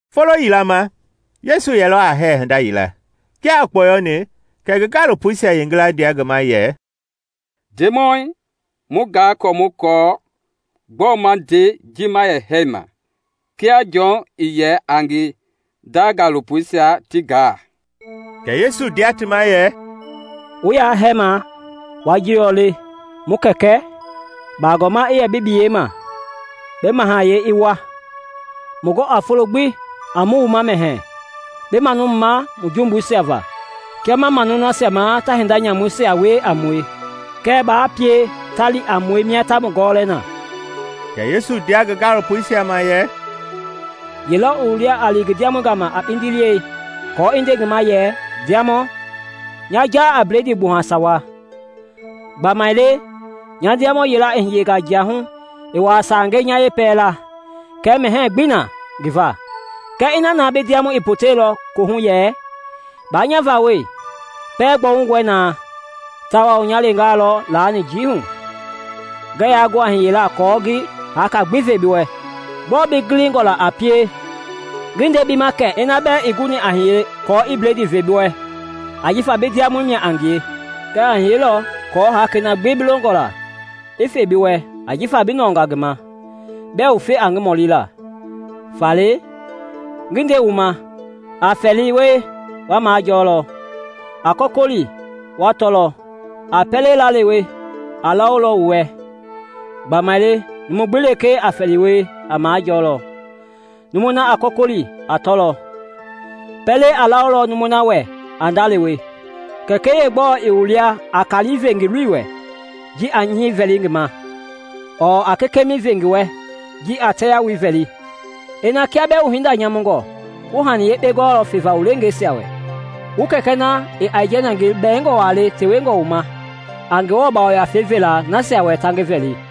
Folo yila ma, Yesu yɛlɔ a hɛɛ hinda yila. Kia i kpɔyɔni, kɛ ngi gaalopoisia yeengila ndia ngi ma yɛ, “Ndemɔi, mu gaa kɔ mu kɔɔ gbɔ ma nde ji ma yɛ hɛma, kia Jɔn i yɛ a ngi nda gaalopoisia ti gaa.” Kɛ Yesu ndia ti ma yɛ, “Wu ya hɛma, wa jilɔ le: ‘Mu Kɛkɛ: Bagɔɔma i yɛ bi biyei ma; Bi mahayɛi i wa. Mu gɔ a folo gbi a mu wuma mɛhɛɛ. Bi manu mu ma mu jumbuisia va, kia ma manu nasia ma ta hinda nyamuisia wie a mue. Kɛɛ baa pie ta li a mue mia ta mu gɔlɛ na.’” Kɛ Yesu ndia ngi gaalopoisia ma yɛ, “Yelɔ i wu lia a li ngi ma ndiamɔ gama a kpindi liɛi kɔ i nde ngi ma yɛ, ‘Ndiamɔ, nya ja a bledii gbuha sawa. Gbamaile, nya ndiamɔ yila a hiye jiahu i waa sange nya yepɛla, kɛɛ mɛhɛɛ gbi na ngi va!’ Kɛ ina na bi ndiamɔi i poteilɔ kohu yɛ, ‘Ba nya vawɔi! Pɛɛ gbɔwungɔi naa, tawao nya lenga lɔ lani njiihu. Ngɛ ya gu a hiyela kɔ ngi haka gbi ve bi wɛ.’ Gbɔɔ bi gilingɔ la a pie? Ngi nde bi ma kɛ ina bɛɛ ii guni aa hiye kɔ i bledii ve bi wɛ ajifa bi ndiamɔ mia a ngie, kɛɛ a hiyelɔ kɔɔ hakei na gbi bi longɔ la i fe bi wɛ ajifa bi nɔɔnga ngi ma, bɛɛ wufe a ngi mɔli la.” “Faale, ngi nde wu ma, A fɛli wie, wa majɔlɔ; a kɔkɔli, wa tɔlɔ; a pɛlei laalewe, a lawolɔ wu wɛ. Gbamaile numu gbi lekee a fɛli wie, a majɔlɔ; numui na a kɔkɔli, a tɔlɔ; pɛlei a lawolɔ numui na wɛ a ndalewe. Kɛkɛi yeegbɛ lɔ i wu lia a kali ve ngi loi wɛ ji a nyɛɛ vɛli ngi ma? Ɔɔ a kekema ve ngi wɛ ji a tɛɛyalu vɛli? Ina kia bɛɛ wu hinda nyamungɔ wu hani yekpengaa gɔɔlɔ feva wu leengeisia wɛ, wu Kɛkɛ na i aijɛnɛ ngi bɛɛngɔ wa le tewengɔ wu ma a Ngewɔ Yafei vela nasia wɛ ta ngi vɛli!”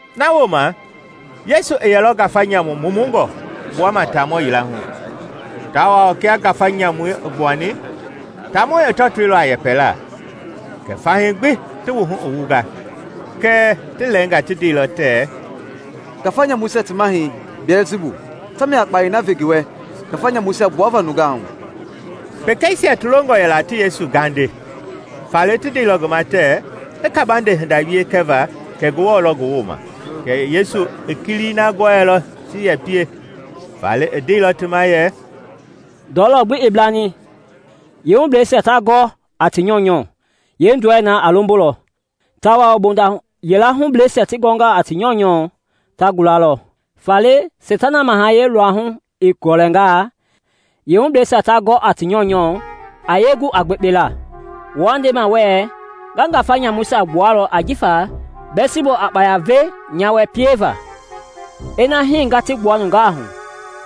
Na wooma Yesu i yɛlɔ ngafa nyamu mumungɔ gbuama taamɔ yila hu; tawao kia ngafa nyamui i gbuani, taamɔi i tɔtoilɔ a yɛpɛla kɛ fahii gbi ti wuhu i wunga. Kɛɛ ti lɛɛnga ti ndeilɔ tɛɛ, “Ngafa nyamuisia ti mahɛi, Biɛlsibu, tamia a kpayei na ve ngi wɛ ngafa nyamuisia gbuava nungaa hu.” Pekeisia ti longɔ yɛla ti Yesu gaande, faale ti ndeilɔ ngi ma tɛɛ i kabande hinda wie kɛva kɛ Ngewɔ lɔ ngi wooma. Kɛɛ Yesu i kilii na gɔɛilɔ ti ye pie, faale i ndeilɔ ti ma yɛ, “Ndɔlɔ gbi i blani, yeehubleisia ta gɔ a ti nyɔunyɔ, yeendɔlɛi a lombolɔ, tawao mbonda yila hubleisia ti gɔ a ti nyɔunyɔ, ta gulalɔ. Faale Seitana mahayɛi luahu i gɔlɛngaa, yeehubleisia ta gɔ a ti nyɔunyɔ, a yee gu a gbekpela? Wua ndema wɛɛ nga ngafa nyamuisia gbualɔ ajifa Biɛlsibu a kpaya ve nya wɛ pieva. Ina hii nga ti gbua nungaa hu,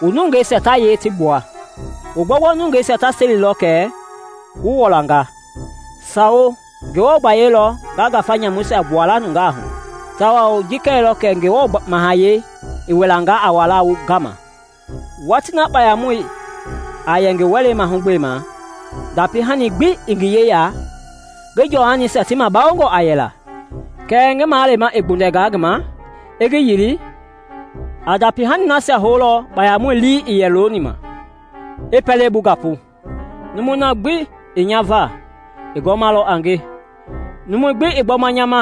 wu nungeisia ta yee ti gbua? Wu gbɔugbɔu nungeisia ta selilɔ kɛ wu wɔlanga! Sawo, Ngewɔ gbayei lɔ nga ngafa nyamuisia gbua la nungaa hu, tawao ji kɛilɔ kɛ Ngewɔ Mahayɛi i wilanga a walaa wu gama. “Watii na kpayamɔi a yɛ ngi wɛlei mahugbema, ndapi-hani gbi i ngi yeya, ngi jɔhanisia ti mabawongɔ a yɛla. Kɛɛ ngi maleema i gbundɛnga ngi ma, i ngi yili, a ndapi hani nasia houlɔ kpayamɔi lii i yɛ looni ma, i pɛlei bu gapu. “Numui na gbi ii nya va, i gɔmalɔ a nge; numu gbi ii gbɔma nya ma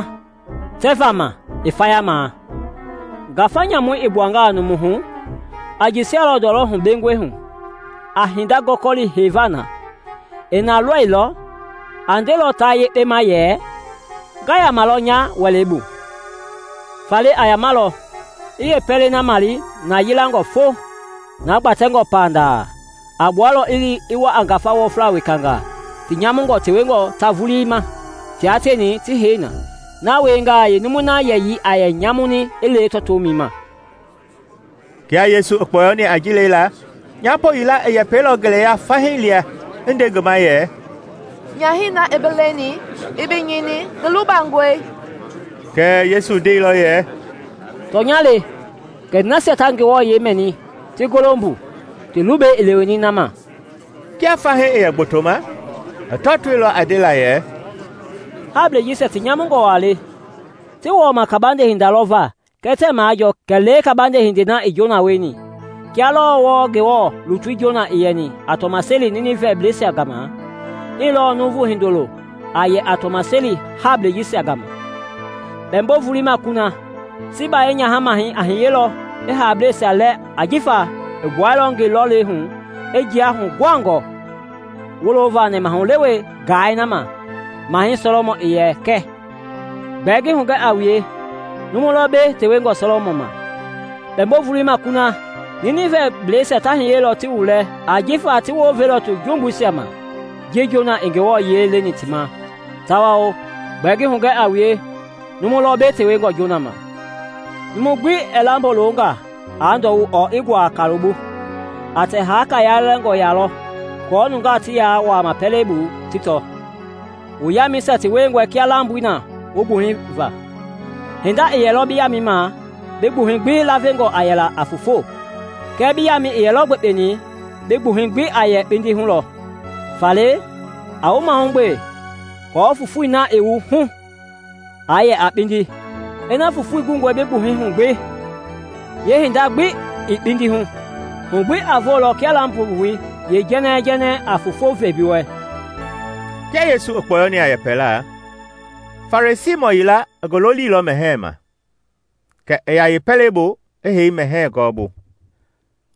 tɛvaa ma, i fayama. “Ngafa nyamui i gbuanga numui hu, a jɛsialɔ ndɔlɔ hubengɔi hu, a hinda gɔkɔli heiva na. Ii na lɔilɔ, a ndelɔ ta yekpe ma yɛ, ‘Nga yamalɔ nya wɛlei bu.’ Faale a yamalɔ, i yeepɛlei male na yilangɔ fo, na gbatɛngɔ panda. A gbualɔ i li i wa a ngafa wɔfla wekanga, ti nyamungɔ tewengɔ ta vulii ma, tia tieni ti hei na. Na wiengaa, yeenumui na yɛyii a yɛ nyamuni i lewe tɔtomɛi ma.” Kia Yesu i kpɔyɔni a ji lela, nyapo yila i yɛpɛilɔ ngeleya fahii lia i nde ngi ma yɛ, “Nyahɛi na i bi leni, i bi nyini, ngi lubangɔe!” Kɛɛ Yesu ndeilɔ yɛ, “Tɔnya le, kɛɛ nasia ta Ngewɔ yiɛi mɛni, ti golo mbu, ti lubɛi i leweni na ma.” Kia fahii i yɛ gbotoma, i tɔtoilɔ a ndela yɛ, “Hablɛi jisia ti nyamungɔ wa le; ti wɔɔma kabande hinda lɔ va kɛɛ tɛɛ majɔɔ kɛlee kabande hindei na i Jona wieni. Kia lɔɔ wɔɔ Ngewɔ lutui Jona i yɛni a tɔmaseli Ninivɛblɛisia gama, hii lɔɔ Nuuvu Hindoloi a yɛ a tɔmaseli hablɛisia gama. Kpɛmbo-volei ma kuna, Siiba yeenyaha-mahɛi a hiyelɔ i hablɛisia lɛɛ ajifa i gbuɛilɔ ngi lɔlei hu i jia huguhangɔ wolova nɛmahulewe gaai na ma Mahɛi Sɔlɔmɔn i yɛ kɛ; gbɛɛ ngi hugɛ a wue, numu lɔ mbei tewengɔ Sɔlɔmɔn ma. Kpɛmbo-volei ma kuna, Ninivɛblɛisia ta hiyelɔ ti wu lɛɛ ajifa ti wounveilɔ ti jumbuisia ma ji Jona i Ngewɔ yiɛi leni ti ma, tawao gbɛɛ ngi hugɛ a wue, numu lɔ mbei tewengɔ Jona ma! “Numu gbi ɛɛ lambo lo nga aa ndɔwu ɔɔ i ngua kaloi bu; a tɛ haaka yalɛngɔ lɔ ya aako nungaa ti ya wuama pɛlei bu ti tɔ. Wu yamɛisia ti wiengɔe kia lamboi na wu gbuhɛi va. Hinda ii yɛlɔ bi yamɛi ma bi gbuhɛi gbi lavengɔ a yɛla a foofo; kɛɛ bi yamɛi ii yɛlɔ gbekpeni, bi gbuhɛi gbi a yɛ kpindi hu lɔ. Faale a wu mahugbe aako fofoi na i wu hu aa yɛ a kpindi. Ina fofoi gungɔe bi gbuhɛi hu gbi, yeehinda gbi ii kpindi hu, hu gbi a voolɔ kia lambo-voi yeejɛŋɛɛ-jɛŋɛɛi a foofo ve bi wɛ.” Kia Yesu i kpɔyɔni a yɛpɛla, Farisiimɔ yila i ngi lolilɔ mɛhɛɛ ma, kɛ i ya yeepɛlei bu i hei mɛhɛɛ gɔɔbu.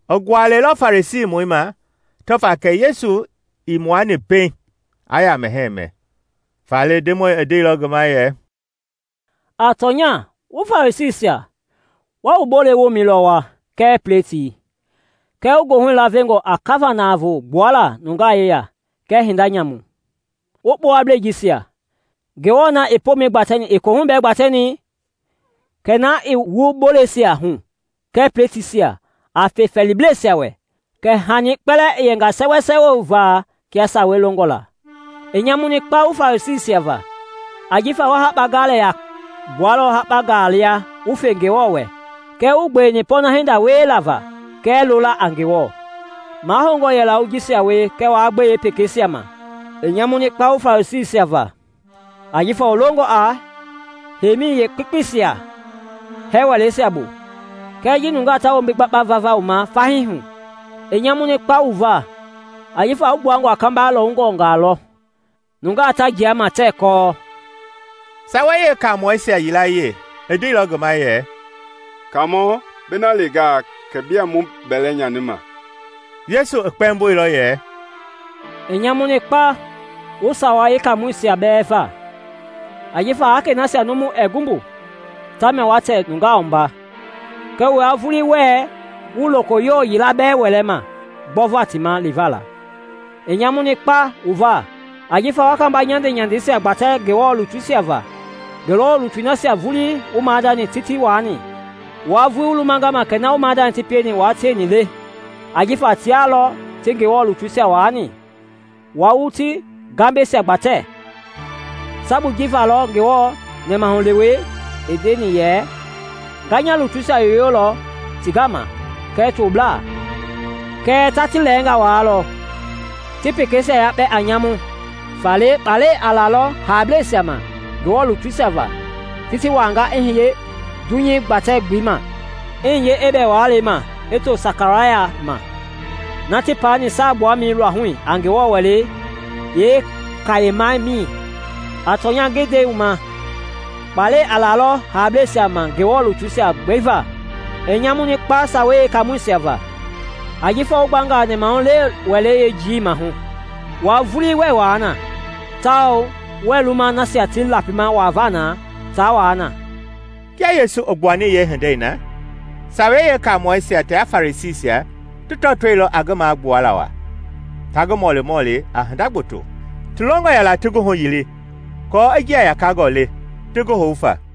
I gualɛilɔ Farisiimɔi ma tɔva kɛ Yesu ii muani pɛiŋ aa ya mɛhɛɛ mɛ. Faale Ndemɔi i ndeilɔ ngi ma yɛ, “A tɔnya wu Farisiisia wa wu bolei womɛi lɔ wua kɛɛ pletii kɛɛ wu goohui lavengɔ a kava-navoo gbuala nungaa yeya kɛɛ hinda nyamu. Wu kpowablei jisia! Ngewɔ na i pomɛi gbatɛni ii kohui bɛɛ gbatɛni? Kɛɛ na i wu boleisia hu kɛɛ pletiisia, a fe fɛɛliblɛisia wɛ, kɛ hani kpɛlɛɛ i yɛnga sɛwɛsɛwɛ wu va kia sawei longɔ la. “I nyamuni kpa wu Farisiisia va! Ajifa wa hakpa galɛ yakpe gbualɔ hakpa gaa lia wu fe Ngewɔ wɛ kɛɛ wuii gbeweni pɔɔna hinda wiela va kɛɛ lola a Ngewɔ. Mahoungɔ yɛla wu jisia wie kɛɛ wa gbe yeepekeisia ma. “I nyamuni kpa wu Farisiisia va! Ajifa wu longɔ a heimi yeekpekpeisia hɛɛ wɛleisia bu, kɛɛ ji nungaa ta wombi gbakpa vava wu ma fahii hu. I nyamuni kpa wu va! Ajifa wu gbuangɔ a kamba lɔwungɔngaa lɔ, nungaa ta jia ma tɛɛ kɔɔ.” Sawei Yeekaamɔisia yilayee i ndeilɔ ngi ma yɛ, “Kaamɔ, bi na lengaa kɛ bia mu bɛlɛ nyanima!” Yesu i kpɛmboilɔ yɛ, “I nyamuni kpa wu Sawei Yeekaamɔisia bɛɛ va! Ajifa hakei nasia numu ɛɛ gu mbu, tamia wa tɛ nungaa wumba, kɛɛ wua vulii wɛɛ wu lokoyowo yila bɛɛ wɛlɛ ma gbɔva ti ma liva la. I nyamuni kpa wu va! Ajifa wa kamba nyandenyandeisia gbatɛ Ngewɔ lutuisia va; Ngewɔ lutui nasia vulii wu maadani ti ti wani. Wua vulii wu lumanga ma kɛ na wu maadani ti pieni wua tieni le; ajifa tia lɔ ti Ngewɔ lutuisia waani, wua wu ti gambɛisia gbatɛ. Sabui ji va lɔ Ngewɔ nɛmahulewei i ndeni yɛ, ‘Nga nya lutuisia yoyolɔ ti gama kɛɛ toblaa; kɛɛ ta ti lɛɛnga waalɔ, ti pekeisia yakpɛ a nyamu.’ Faale kpalɛ a lalɔ hablɛisia ma Ngewɔ lutuisia va ti ti wanga i hiye dunyei gbatɛ-gbelei ma, i hiye Ebɛl walei ma i to Sakaraya ma, na ti paani saagbuamɛi luahu a Ngewɔ Wɛlei yeekayemamɛi. A tɔnya ngi nde wu ma, kpalɛ a lalɔ hablɛisia ma Ngewɔ lutuisia gbi va. “I nyamuni kpa Sawei Yeekaamɔisia va! Ajifa wu gbanga nɛmahulewe wɛlei yeejiiwii mahu; wua vulii wɛɛ wua na tawao wɛɛ luma nasia ti lapima wuavaa na taa wua na!” Kia Yesu i gbuani yeehindei na, Sawei Yeekaamɔisia tia Farisiisia ti tɔtoilɔ a ngi magbuala wa, ta ngi mɔlimɔli a hinda gboto, ti longɔ ti ngi huyili aako i njia yakangɔ le ti ngi hou fa.